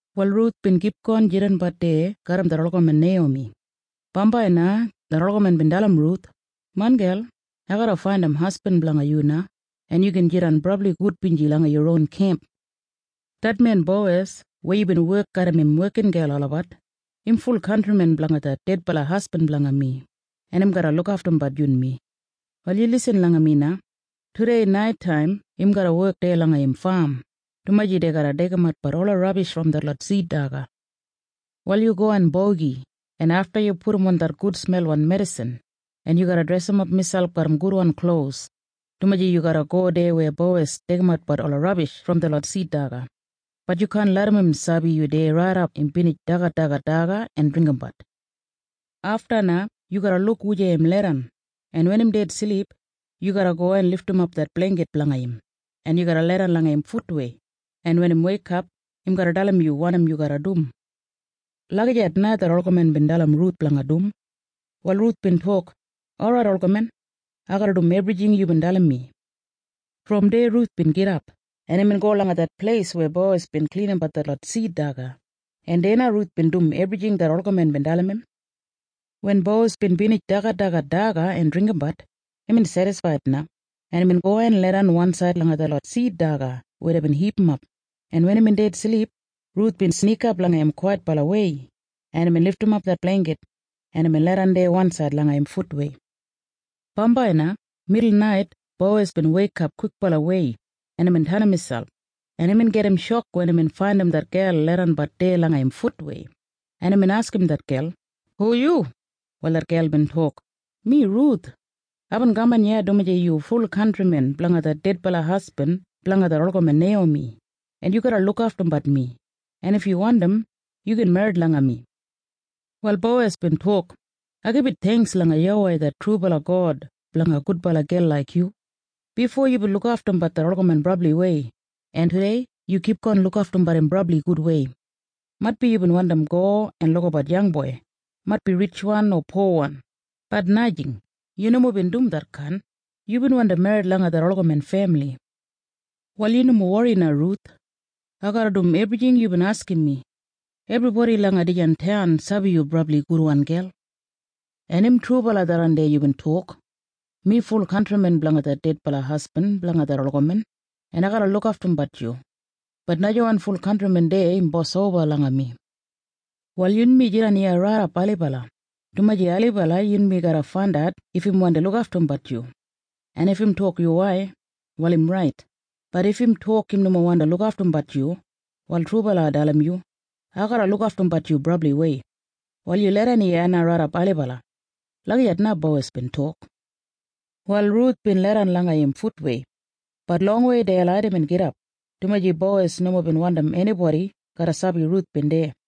Wal Ruth bin kipgon jidanbat deya garram det olgamen Neiyomi. Bambai na det olgamen bin dalim Ruth, “Main gel, ai garra faindim hasbin blanga yu na, en yu gin jidan brabli gudbinji langa yu ron kemp. Det men Bowes weya yubin wek garram im wekingel olabat, im ful kantrimen blanga det dedbala hasbin blanga mi, en im garra lukaftumbat yunmi. “Wal yu lisin langa mi na. Tudei naitaim im garra wek deya langa im fam, dumaji dei garra deigimatbat ola rabish brom detlot sid daga. Wal yu go en bogi, en afta yu pudumon det gudsmelwan medisin, en yu garra dresimap miselp garram gudwan klos, dumaji yu garra go deya weya Bowes deigimatbat ola rabish brom detlot sid daga. Bat yu kaan larram im sabi yu deya raidap im binij dagadagat daga en dringgimbat. Afta na yu garra luk wujei im leidan, en wen im ded silip, yu garra go en lidimap det bleingkit blanga im, en yu garra leidan langa im futwei, en wen im weikap, im garra dalim yu wanim yu garra dum.” Lagijat na det olgamen bin dalim Ruth blanga dum. Wal Ruth bin tok, “Orait, olgamen. Ai garra dum ebrijing yubin dalim mi.” Brom deya Ruth bin gidap, en imbin go langa det pleis weya Bowes bin klinimbat detlot sid daga, en deya na Ruth bin dum ebrijing det olgamen bin dalim im. Wen Bowes bin binij dagadagat daga en dringgimbat, imbin sedisfaid na, en imbin go en leidan wansaid langa detlot sid daga weya deibin hipimap, en wen imbin ded silip, Ruth bin snikap langa im kwaitbalawei, en imbin lidimap det bleingkit, en imbin leidan deya wansaid langa im futwei. Bambai na midulnait Bowes bin weikap kwikbalawei, en imbin tenim miselp, en imbin gedim shok wen imbin faindim det gel leidanbat deya langa im futwei, en imbin askim det gel, “Hu yu?” Wal det gel bin tok, “Mi Ruth. Aibin kaman iya dumaji yu ful kantrimen blanga det dedbala hasbin blanga det olgamen Neiyomi, en yu garra lukaftumbat mi. En if yu wandim, yu gin merrit langa mi.” Wal Bowes bin tok, “Ai gibit theingks langa YAWEI det trubala God blanga gudbala gel laik yu. Bifo yubin lukaftumbat det olgamen brabliwei, en tudei yu kipgon lukaftumbat im brabli gudwei. Maitbi yu bina go en lukabat yangboi, o maitbi ritjwan o powan. Bat najing. Yu nomo bin dum detkain. Yubin wandi merrit langa det olgamen femili. “Wal yu nomo wori na Ruth. Ai garra dum ebrijing yubin askim mi. Ebribodi langa dijan taun sabi yu brabli gudwan gel. En im trubala tharran deya yubin tok. Mi ful kantrimen blanga det dedbala hasbin blanga det olgamen, en ai garra lukaftumbat yu. Bat najawan ful kantrimen deya im bos oba langa mi. “Wal yunmi jidan iya raidap ailibala, dumaji ailibala yunmi garra faindat if im wandi lukaftumbat yu. En if im tok yuwai, wal im rait. Bat if im tok im nomo wandi lukaftumbat yu, wal trubala ai dalim yu. Ai garra lukaftumbat yu brabliwei. Wal yu leidan iya na raidap ailibala.” Lagijat na Bowes bin tok. Wal Ruth bin leidan langa im futwei. Bat longwei deilait imbin gidap, dumaji Bowes nomo bin wandim enibodi garra sabi Ruth bin deya.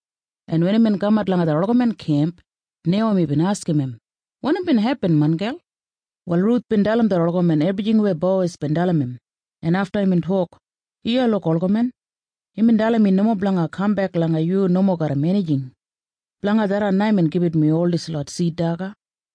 en wen imbin kamat langa det olgamen kemp, Neiyomi bin askim im, “Wanim bin hepin, main gel?” Wal Ruth bin dalim det olgamen ebrijing weya Bowes bin dalim im, en afta imbin tok, “Iya luk, olgamen. Imbin dalim mi nomo blanga kambek langa yu nomo garram enijing. Blanga tharran na imbin gibit mi ol dislot sid daga.”